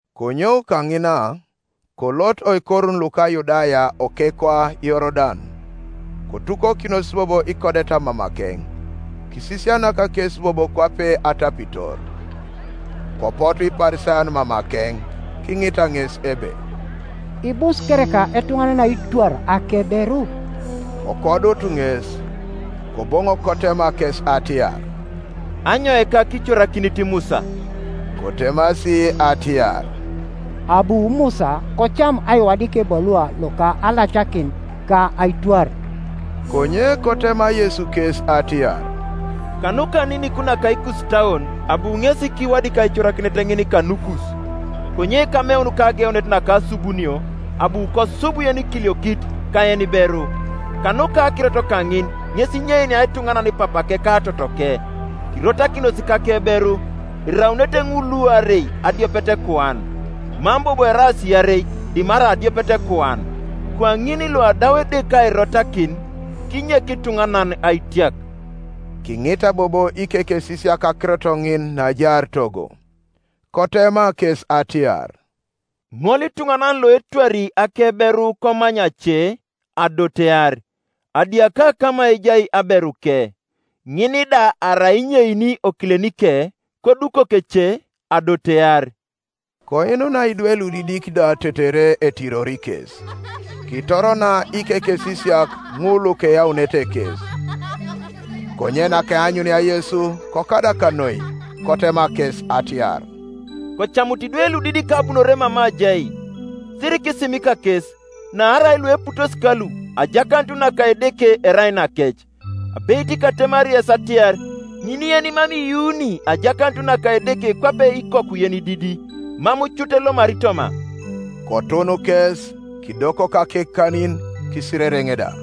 Konyou kaŋina, kolot oikorun luko Yudaya okekwa Yorodan: kotukokinos bobo ikodeta mamakeŋ; kisisianak kes bobo kwape atapitor. Kopotu Iparisayon mamakeŋ, kiŋita ŋes ebe, “Ibus kereka etuŋanan aitwar akeberu?” Kokodut ŋes. Koboŋok kotema kes atiar, “Anyoika kicorakinit Musa?” Kotemasi atiar, “Abu Musa kocam aiwadik ebalua loka alacakin, ka aitwar.” Konye kotema Yesu kes atiar, “Kanuka aninik naka ikusitauon abu ŋesi kiwadik aicorakinet ŋin kanukus. Konye ameun kageunet naka asubunio, ‘Abu kosub yenikiliokit ka yeniberu.’ Kanuka akirot kaŋin ŋes inyeinia etuŋanan papake ka totoke, kirotakinos kakeberu; eraunete ŋul luarei adiopetekuan: mam bobo eraas iarei dimarai adiopetekuan. Kwaŋin luadau Edeke airotakin, kinyek ituŋanan aitiak.” Kiŋita bobo ikekesisiak akirot ŋin naajaar togo. Kotema kes atiar, “Ŋolituŋanan loetwari akeberu komany ace, adotear, adiaka kama ejai aberuke. Ŋin da arai inyeini okilenike, kodukok ece, adotear.” Koinunai idwe ludidik da tetere etirori kes; kitorona ikekesisiak ŋul lukeyaunete kes. Konye nakeanyunia Yesu kokadak noi, kotema kes atiar, “Kocamutu idwe ludidik abunore mama ajai, sirikisimika kes; naarai lueputos kalu ajakanut naka Edeke erai nakec. Abeit katemari yes atiar, Ŋin yenimam iyuuni ajakanut naka Edeke kwape ikoku yenididi, mam cut elomari toma.” Kotun kes, kidokok akekanin, kisirereŋ da.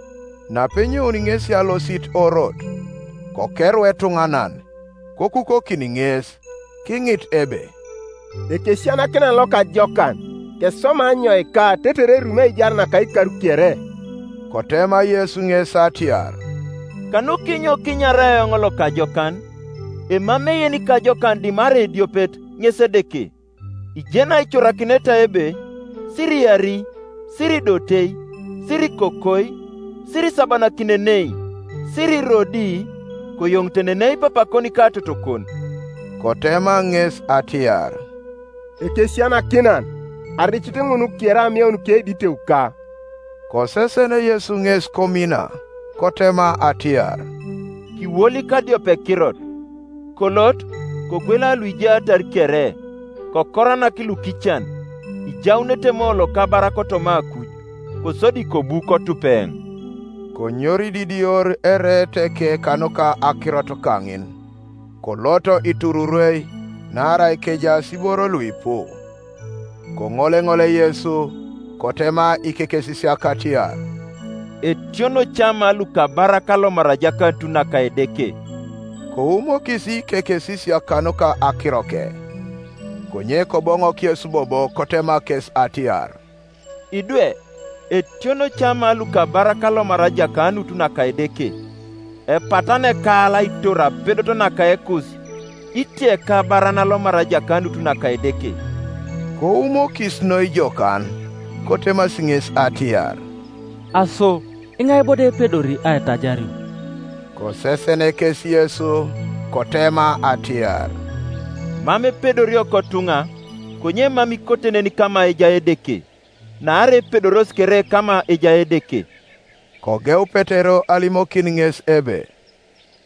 Napenyouni ŋesi alosit orot, kokeru etuŋanan; kokukokin ŋes, kiŋit ebe, “Ekesisianakinan lokajokan, keswama anyoika tetere erumi aijar naka ikar kere?” Kotema Yesu ŋes atiar, “Kanukinyo kinyaraaa eoŋ lokajokan? Emamei yenikajokan dimarai ediopet, ŋes Edeke. Ijeni aicorakineta ebe, Siriari, Siridote, Sirikokoi, Sirisabanakinenei, Sirirodi, Koyoŋitenenei papakon ka totokon.” Kotema ŋes atiar, “Ekesisianakinan, aricit ŋun kere ameun keiditeuka.” Kosesen Yesu ŋes komina, kotema atiar, “Kiwolik adiopekirot: kolot, kogwela luijaatar kere, kokoranak lukican, ijaunete moolo kabar kotoma akuj: kosodi kobu kotup eoŋ.” Konyorididior ereeteke kanuka akirot kaŋin, kolot itururwei: naarai kejaas iboro luipu. Koŋoleŋole Yesu, kotema ikekesisiak atiar, “Etiono ca ma lukabarak alomar ajakanut naka Edeke!” Koumokis ikekesisiak kanuka akiroke, Konye Koboŋok Yesu bobo, kotema kes atiar, “Idwe, etiono ca ma lukabarak alomar ajakanut naka Edeke! Epatana ekaal aitor apedot naka ekus, itia ekabaran alomar ajakanut naka Edeke.” Koumokis noi jokan, kotemasi ŋes atiar, “Aso iŋai bo do epedori aitajario?” Kosesen kes Yesu kotema atiar, “Mam epedorio kotuŋa, konye mam ikote nen kama ejai Edeke: naarai epedoros kere kama ejai Edeke.” Kogeu Petero alimokin ŋes ebe,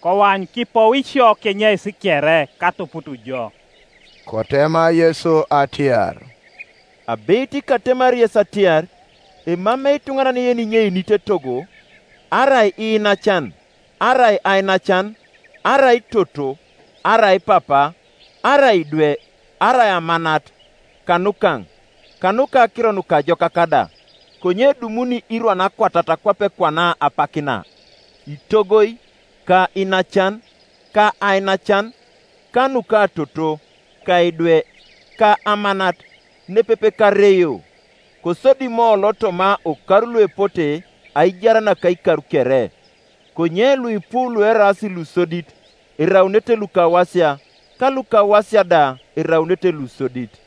“Koany, kipou isio kenyeis kere, katuputu jo.” Kotema Yesu atiar, “Abeit katemari yes atiar, Emamei ituŋanan yeninyeinit etogo, arai iinacan, arai ainacan, arai toto, arai papa, arai idwe, arai amanat, kanukaŋ, kanuka Akiro Nukajokak da, konye edumuni irwan akwatat kwape kwana apak na, itogoi, ka iinacan, ka ainacan, ka nukatoto, ka idwe, ka amanat, nepepe kareio; kosodi moolo toma okar luepote aijar naka ikar kere. Konye luipu lueraas lusodit eraunete lukawasia; ka lukawasia da eraunete lusodit.”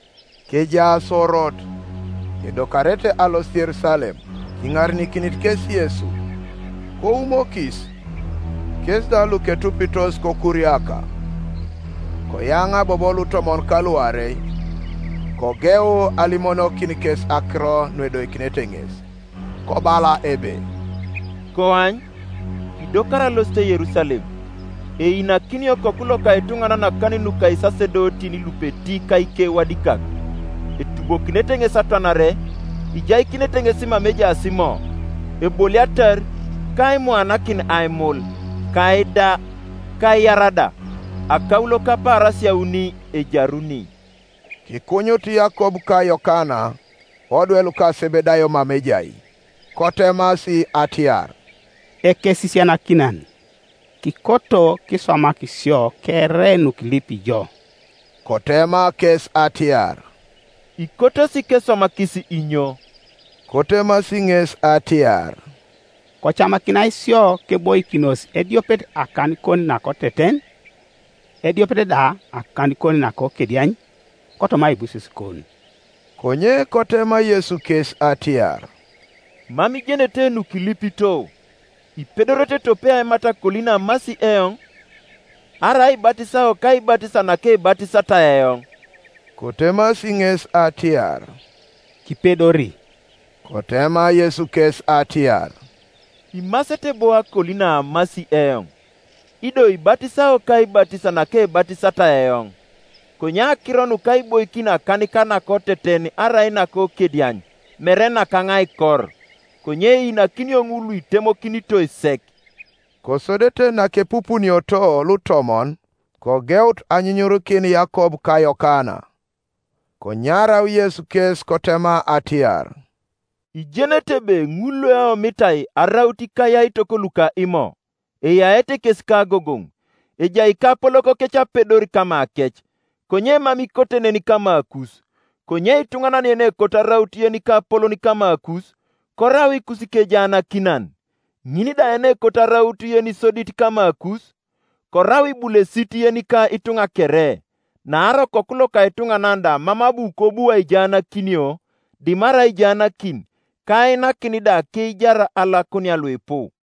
Kejaas orot, edokarete alosit Yerusalem; kiŋarenikinit kes Yesu: koumokis; kes da luketupitos kokuriaka. Koyaŋa bobo lutomon kaluarei, kogeu alimonokin kes akiro nuedoikinete ŋes. Kobala ebe, “Koany, kidokari alosit Yerusalem; einakinio Okoku loka etuŋanan akanin nuka isasedotin lupeti ka ikewadikak; etubokinete ŋes atwanare, ijaikinete ŋes mama ejaas Imo, Eboliatar, ka aimuanakin aimul, ka aida, ka aiar da; akaulo kapaarasia auni ejaruni.” Kikunyut Yakob ka Yokana, odwe luka Sebedayo mama ejai, kotemasi atiar, “Ekesisianakinan, kikoto kiswamak sio kere nukilipi jo.” Kotema kes atiar, “Ikotosi keswamakis inyo?” Kotemasi ŋesi atiar, “Kocamakinai sio keboikinos ediopet akanikon nakoteten, ediopet da akanikon nakokediany, kotoma aibusesukon.” Konye kotema Yesu kes atiar, “Mam ijenete nukilipito. Ipedorete tope aimat akoli naamasi eoŋ? Arai aibatisao kaibatis nakebatisatai eoŋ?” Kotemasi ŋes atiar, “Kipedori.” Kotema Yesu kes atiar, “Imasete bo akoli naamasi eoŋ: ido ibatisao kaibatis nakebatisatai eoŋ: konye akiro nuka aiboikin akanika nakoteten arai nakokediany mere nakaŋ aikor: konye einakinio ŋul luitemokinitoi sek.” Kosodete nakepupunioto lutomon kogeut anyunyurikin Yakob ka Yokana. Konyarau Yesu kes kotema atiar, “Ijenete ebe ŋul lueomitai araut ikayaitok luka Imo, eyaete kes kagogoŋ: ejai ikapolokokec apedor kamakec. Konye mam ikote nen kamakus: konye ituŋanan yenekoto araut yenikapolon kamakus, korau ikusikejaanakinan; ŋin da yenekoto araut yenisodit kamakus, korau ibulesit yenika ituŋa kere, Naarai Okoku loka etuŋanan da mam abu kobu aijaanakinio, dimarai aijaanakin, ka ainakin da akeijar alakunia luipu.”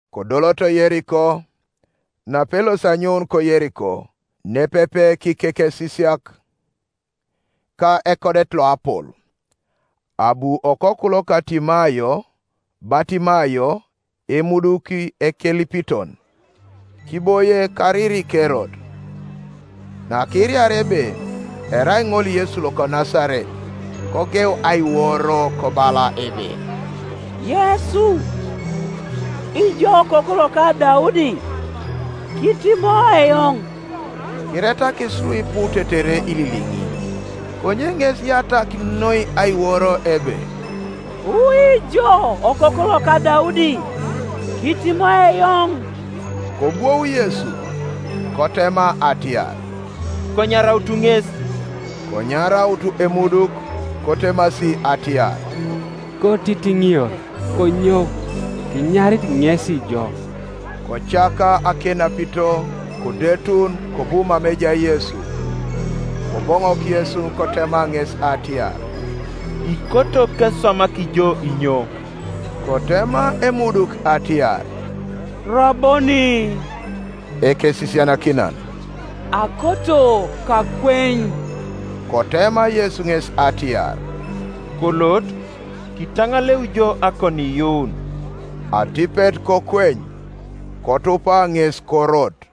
Kodoloto Yeriko: napelosi anyoun ko Yeriko, nepepe kikekesisiak ka ekodet loapol, abu okoku loka Timayo, Batimayo, emuduki ekelipiton, kiboie kariri kerot, Nakiiraria ebe erai ŋol Yesu loko Nasaret, kogeu aiworo, kobala ebe, “Yesu, ijo okoku loka Daudi, kitimoi eoŋ.” Kiretakis luipu tetere ililiŋi: konye ŋes kiyatak noi aiworo ebe, “Wu ijo okoku loka Daudi, kitimoi eoŋ.” Kobwou Yesu, kotema atiar, “Konyarautu ŋes,” Konyaraut emuduk, kotemasi atiar, “Kotitiŋior: konyou, kinyarit ŋesi jo.” Kocaka akenapito, kodetun, kobu mama ejai Yesu. Koboŋok Yesu kotema ŋes atiar, “Ikoto keswamak jo inyo?” Kotema emuduk atiar, “Raboni, (Ekesisianakinan,) akoto kakweny.” Kotema Yesu ŋes atiar, “Kolot: kitaŋaleu jo akoniiyuun.” Atipet kokweny, kotupa ŋes korot.